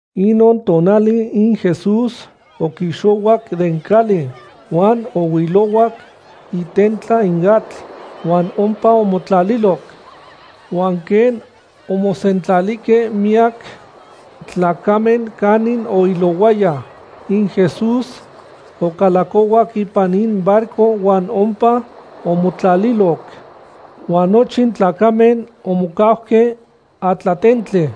Inon tonali in Jesús oquixohuac den cali huan ohuilohuac itentla in atl huan ompa omotlalilo. Huan quen omosentlalihque miyac tlacamen canin oilohuaya, in Jesús ocalacohuac ipan in barco huan ompa omotlaliloc. Huan nochin tlacamen omocauque atlatentli.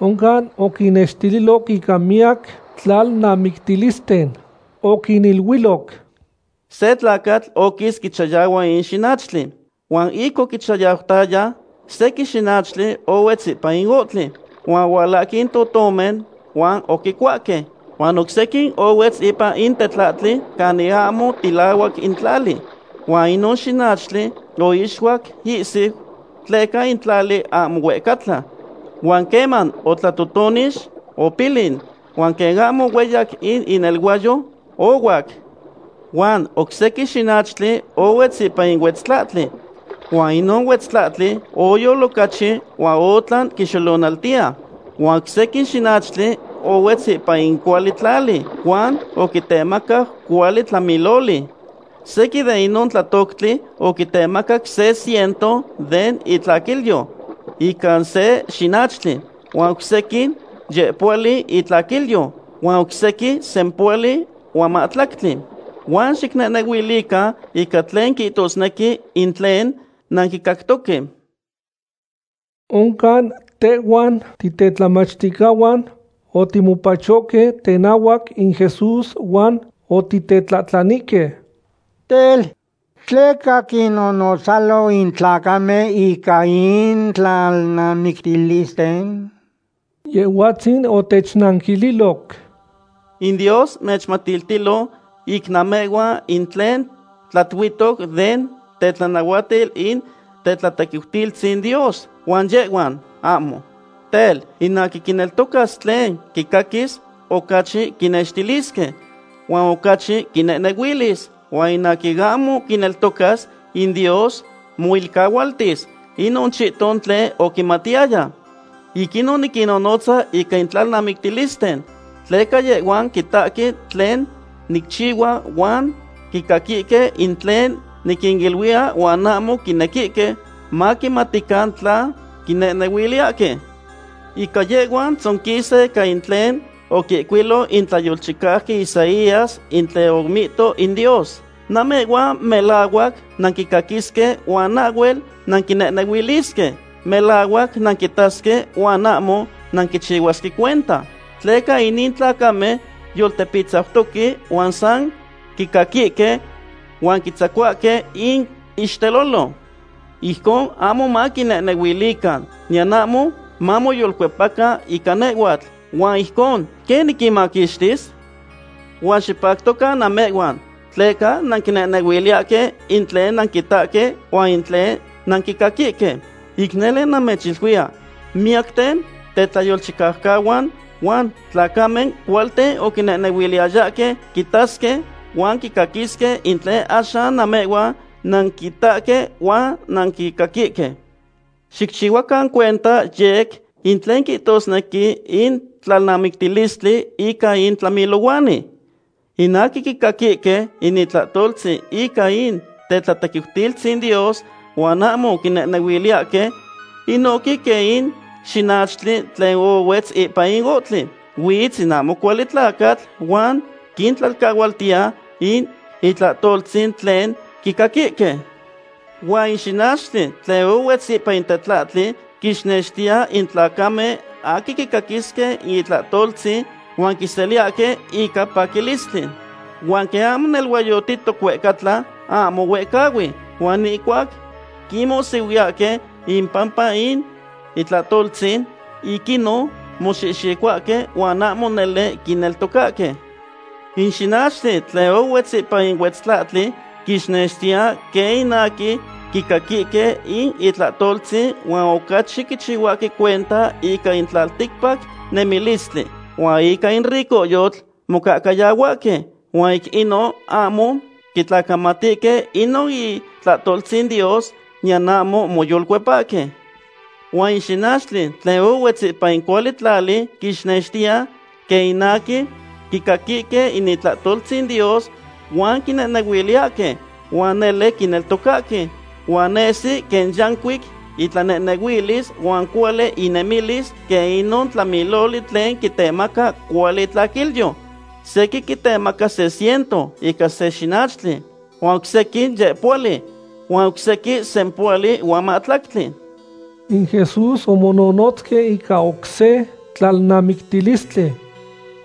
Oncan oquinnextililoc ica miyac tlalnamictilisten. Oquiniluiloc: ―Se tlacatl oquis quichayahua in xinachtli. Huan ic oquichayautaya, sequin xinachtli ohuetz ipan in ohtli, huan ohualahque in totomen, huan oquicuahque. Huan oc sequin ohuetz ipan in tetlahtli canin ahmo tilahuac in tlali. Huan inon xinachtli oixuac ihsiu tleca in tlali ahmo huehcatla. Huan queman otlatotonix, opilin, huan quen ahmo hueyac in ineluayo, ohuac. Huan oc sequin xinachtli ohuetz ipan in huetztlahtli, huan inon huetztlahtli oyol ocachi huan otlan quixolonaltiya. Huan oc sequin xinachtli ohuetz ipan in cuali tlali huan oquitemacac cuali tlamiloli. Sequin de inon tlatoctli oquitemacac se ciento den itlaquilyo ica se xinachtli, huan oc sequin yehpohuali itlaquilyo, huan oc sequin sempohuali huan mahtlactli. Huan xicnehnehuilican ica tlen quihtosnequi in tlen nanquicactoque. Oncan tehhuan titetlamachticahuan otimopachohque tenahuac in Jesús huan otitetlahtlanihque: ―Tel, ¿tleca quinnonotzalo in tlacamen ica in tlalnamictilisten? Yehhuatzin otechnanquililoc: ―In Dios mechmatiltilo ic namehhuan in tlen tlatiutoc den tetlanahuatil in tetlatequiutilistzin Dios, huan yehhuan, ahmo. Tel, in aquin quineltocas tlen quicaquis, ocachi quinextilisque, huan ocachi quinehnehuilis. Huan in aquin ahmo quineltocas, in Dios moilcahualtis inon chihton tlen oquimatiyaya. Ic inon niquinnonotza ica in tlalnamictilisten, tleca yehhuan quitahque tlen nicchihua huan quicaquihque in tlen niquiniluiya huan ahmo quinequihque maquimatican tla quinehnehuiliyahque. Ica yehhuan tzonquisa ica in tlen oquihcuilui in tlayolchicauqui Isaías in tlen omihto in Dios: Namehhuan melahuac nanquicaquisque huan ahhuel nanquinehnehuilisque. Melahuac nanquitasque huan ahmo nanquichihuasque cuenta. Tleca inin tlacamen yoltepitzautoque huan san quicaquihque, huan quitzacuahque in ixtelolo. Ijcon ahmo maquinehnehuilican, niyan ahmo mamoyolcuepacan ica nehhuatl, ¿huan ijcon quen niquinmaquixtis? ’Huan xipactocan namehhuan, tleca nanquinehnehuiliyahque in tlen nanquitahque huan in tlen nanquicaquihque. Ic nele namechiluiya, miyacten tetlayolchicaucahuan huan tlacamen cualten oquinequiyayahque quitasque huan quicaquisque in tlen axan namehhuan nanquitahque huan nanquicaquihque. ’Xicchihuacan cuenta yec in tlen quihtosnequi in tlalnamictilistli ica in tlamilohuani. In aquin quicaquihque in itlahtoltzin ica in tetlatequiutilistzin Dios huan ahmo quinehnehuiliyahque, inohque quen in xinachtli tlen ohuetz ipan in ohtli. Huitz in ahmo cuali tlacatl huan quintlailcahuatiya in itlahtoltzin tlen quicaquihque. Huan in xinachtli tlen ohuetz ipan in tetlahtli quixnextiya in tlacamen aquin quicaquihque in itlahtoltzin huan quiseliyahque ica paquilistli. Huan quen ahmo neluayotihtoc huehcatla, ahmo huehcahui. Huan ihcuac quinmohsihuiyahque ipampa in itlahtoltzin, ic inon moxihxicohuahque huan ahmo nele quineltocahque. In xinachtli tlen ohuetz ipan in huetztlahtli quixnextiya quen in aquin quicaquihque in itlahtoltzin huan ocachi quichihuahque cuenta ica in tlalticpac nemilistli, huan ica in ricohyotl mocahcayahuahque. Huan ic inon ahmo quitlacamatihque inon itlahtoltzin Dios, niyan ahmo moyolcuepahque. Huan in xinachtli tlen ohuetz ipan in cuali tlali quixnextiya quen in aquin quicaquihque in itlahtoltzin Dios huan quinehnehuiliyahque, huan nele quineltocahque. Huan nesi quen yancuic intlanehnehuilis huan cuali innemilis quen inon tlamiloli tlen quitemaca cuali itlaquilyo. Sequin quitemaca se ciento ica se xinachtli, huan oc sequin yehpohuali, huan oc sequin sempohuali huan mahtlactli. In Jesús omononotzque ica oc se tlalnamictilistli: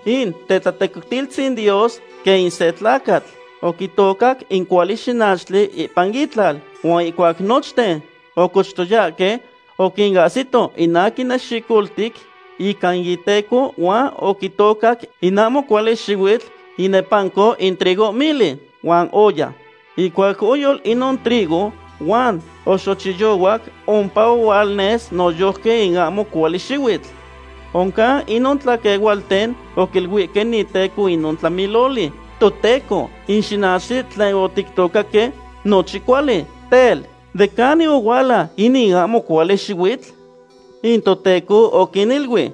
―In tetlatequiutilistzin Dios quen in se tlacatl oquitocac in cuali xinachtli ipan itlal. Huan ihcuac nochten ocochtoyahque, oquinahsito in aquin nexicoltic ica in iteco huan oquitocac in ahmo cuali xihuitl inepanco in trigohmili huan oya. Ihcuac oyol inon trigo huan oxochiyohuac, ompa ohualnes noyojqui in ahmo cuali xihuitl. Oncan inon tlaquehualten oquiluihque in iteco inon tlamiloli: “Toteco, in xinachtli tlen otictocaque nochin cuali. Tel, ¿de canin ohuala inin ahmo cuali xihuitl?” In iteco oquiniluic: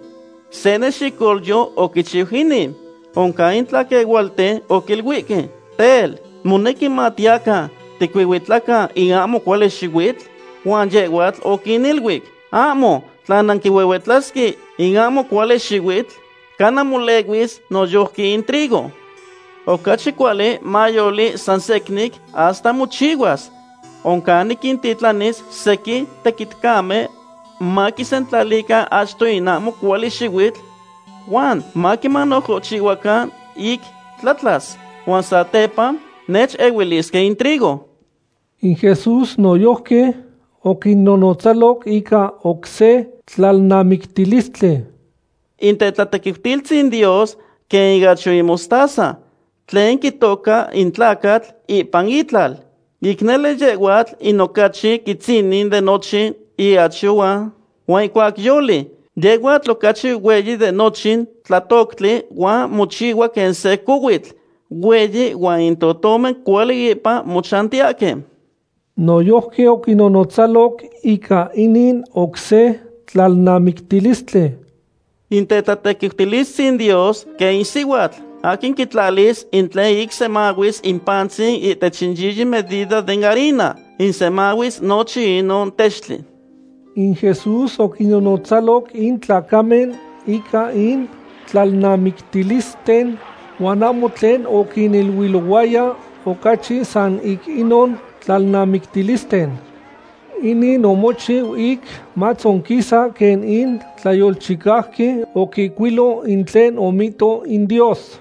“Se nexicolyo oquichiu inin.” Oncan in tlaquehualten oquiluihque: “Tel, ¿monequi matiyacan ticuihuitlacan in ahmo cuali xihuitl?” Huan yehhuatl oquiniluic: “Ahmo, tla ic nanquihuihuitlasque in ahmo cuali xihuitl, cana molehuis noyojqui in trigo. Ocachi cuali mayoli san secnin hasta mochihuas. Oncan niquintitlanis sequin tequitcamen maquisentlalican achto in ahmo cuali xihuitl, huan maquimanojohchihchihuacan ic tlatlas. Huan satepa nechehuilisque in trigo.” In Jesús noyojqui oquinnonotzaloc ica oc se tlalnamictilistli: ―In tetlatequiutilistzin Dios quen in iachyo in mostaza, tlen quitoca in tlacatl ipan itlal. Ic nele yehhuatl in ocachi quitzinin de nochin iachyo huan ihcuac yoli, yehhuatl ocachi hueyi de nochin tlatoctli huan mochihua quen se cohuitl hueyi huan in totomen cuali ipan mochantiyahque. Noyojqui oquinnonotzaloc ica inin oc se tlalnamictilistli: ―In tetlatequiutilistzin Dios quen in sihuatl aquin quitlalis in tlen ic semahuis in pantzin ihtech in yiyi medida den harina, ic semahuis nochin inon textli. In Jesús oquinnonotzaloc in tlacamen ica in tlalnamictilisten, huan ahmo tlen oquiniluilohuaya ocachi san ic inon tlalnamictilisten. Inin omochiu ic matzonquisa quen in tlayolchicauqui oquihcuilo in tlen omihto in Dios: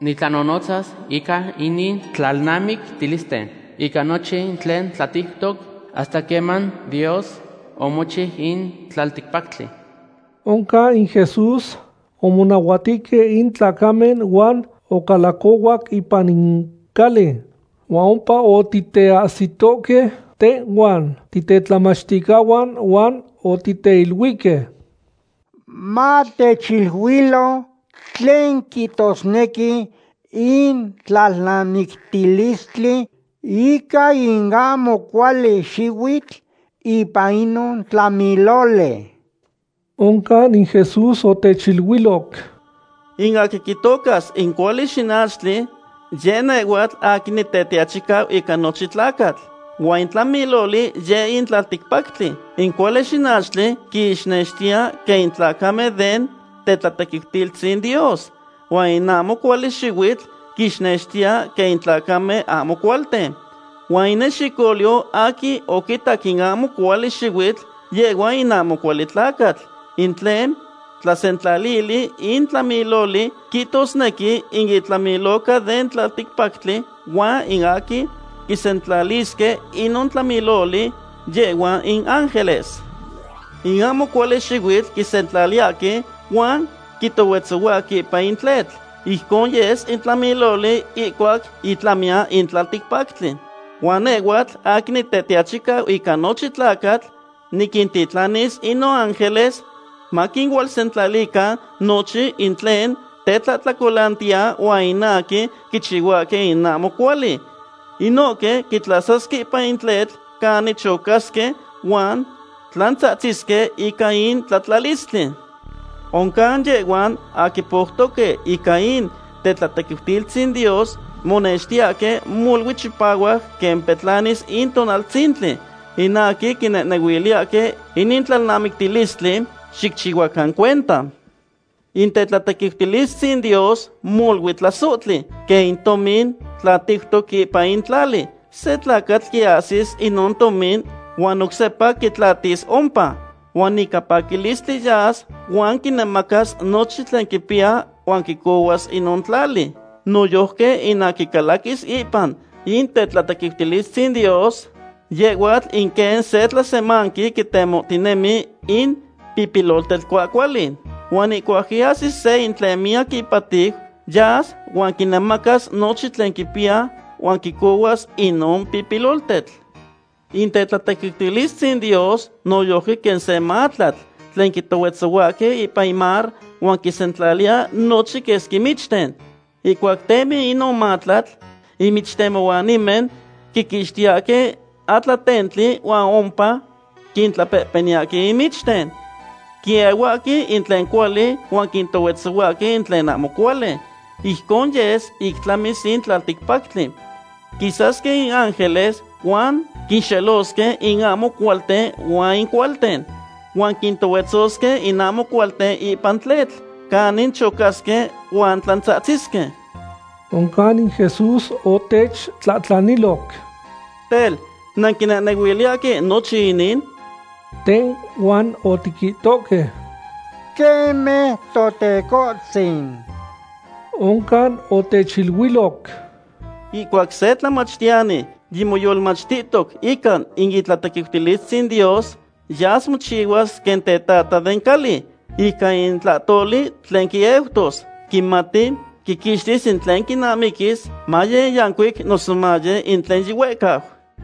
Nitlanonotzas ica inin tlalnamictilisten ica nochin tlen tlatiutoc hasta queman Dios omochiu in tlalticpactli. Oncan in Jesús omonahuatihque in tlacamen huan ocalacohuac ipan in cali. Huan ompa otiteahsitohque tehhuan titetlamachticahuan huan otiteiluihque: ―Matechiluilo tlen quihtosnequi in tlalnamictilistli ica in ahmo cuali xihuitl ipan inon tlamiloli. Oncan in Jesús otechiluiloc: ―In aquin quitocas in cuali xinachtli yeh nehhuatl aquin Nitetiachicau ica nochin tlacatl. Huan in tlamiloli yeh in tlalticpactli. In cuali xinachtli quixnextiya quen in tlacamen den tetlatequiutilistzin Dios, huan in ahmo cuali xihuitl quixnextiya quen in tlacamen ahmo cualten. Huan in nexicolyo aquin oquitocac in ahmo cuali xihuitl, yehhua in ahmo cuali tlacatl. In tlen tlasentlalili in tlamiloli quihtosnequi in itlamiloca den tlalticpactli, huan in aquin quisentlalisque inon tlamiloli, yehhuan in ángeles. In ahmo cuali xihuitl quisentlaliyahque huan quitohuetzohuahque ipan in tletl. Ijcon yes in tlamiloli ihcuac itlamiyan in tlalticpactli. Huan nehhuatl aquin Nitetiachicau ica nochin tlacatl niquintitlanis in noángeles maquinualsentlalican nochin in tlen tetlahtlacolanaltiya huan in aquin quichihuahque in ahmo cuali. Inohque quintlasasque ipan in tletl canin chocasque huan tlantzahtzisque ica in tlatlalistli. Oncan yehhuan aquin poutoque ica in tetlatequiutilistzin Dios monextiyahque molui chipahuac quen petlanis in tonaltzintli. In aquin quinehnehuiliyahque inin tlalnamictilistli, xicchihuacan cuenta. ’In tetlatequiutilistzin Dios molui tlasohtli, quen in tomin tlatiutoc ipan in tlali. Se tlacatl quiahsis inon tomin huan oc sepa quitlatis ompa. Huan ica paquilistli yas huan quinemacas nochin tlen quipiya huan quicohuas inon tlali. ’Noyojqui in aquin calaquis ipan in tetlatequiutilistzin Dios, yehhuatl in quen se tlasemanqui quitemohtinemi in pipiloltetl cuahcuali. Huan ihcuac quiahsis seya in tlen miyac ipatiu, yas huan quinemacas nochin tlen quipiya huan quicohuas inon pipiloltetl. ’In tetlatequiutilistzin Dios noyojqui quen se matlatl tlen quitohuetzohuahque ipan in mar huan quisentlaliya nochin quesqui michten. Ihcuac temi inon matlatl, in michtemohuanimen quiquixtiyahque atlatentli huan ompa quintlapehpeniyahque in michten. Quiehuahque in tlen cuali huan quitohuetzohuahque in tlen ahmo cuali. Ijcon yes ic tlamis in tlalticpactli. Quisasque in ángeles huan quinxelosque in ahmo cualten huan in cualten. Huan quintohuetzosque in ahmo cualten ipan in tletl canin chocasque huan tlantzahtzisque. Oncan in Jesús otechtlahtlaniloc: ―Tel, ¿nanquinehnehuiliyahque nochin inin? Tehhuan otiquihtohque: ―Queme, Totecohtzin. Oncan otechiluiloc: ―Ihcuac se tlamachtiyani yimomachtihtoc ica in tetlatequiutilistzin Dios, yas mochihuas quen tetata den cali. Ica in tlahtoli tlen quieutos, quimati quiquixtis in tlen quinamiquis, maye in yancuic noso maye in tlen yihuehcau.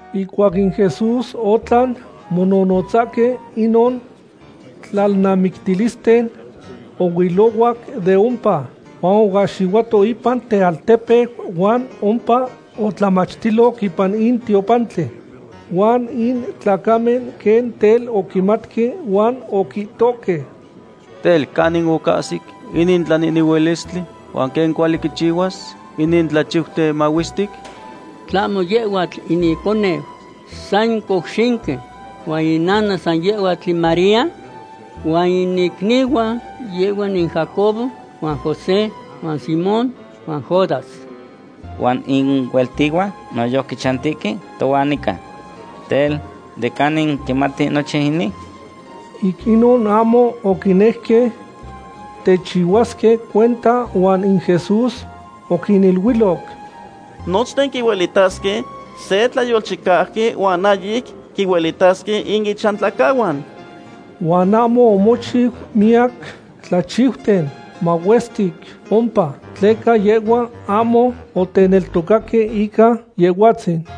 Ihcuac in Jesús otlan mononotzahque inon tlalnamictilisten, ohuilohuac de ompa. Huan oahxihuato ipan tealtepeu huan ompa otlamachtiloc ipan in tiopantli. Huan in tlacamen quen tel oquimatque huan oquihtohque: ―Tel, ¿canin ocahsic inin tlanehnehuilistli, huan quen cuali quichihuas inin tlachiuten mahuestic? ¿Tlahmo yehhuatl in iconeu san in couxinqui, huan inana san yehhuatl in María? Huan in icnihuan yehhuan in Jacobo, huan José, huan Simón, huan Judas. Huan in ihueltihuan noyojqui chantihque tohuan nican. Tel, ¿de canin quimati nochin inin? Ic inon ahmo oquinejque techihuasque cuenta huan in Jesús oquiniluiloc: ―Nochten quihuelitahque se tlayolchicauqui huan ahyic quihuelitasque in ichantlacahuan. Huan ahmo omochiu miyac tlachiuten mahuestic ompa, tleca yehhuan ahmo oteneltocaque ica Yehhuatzin.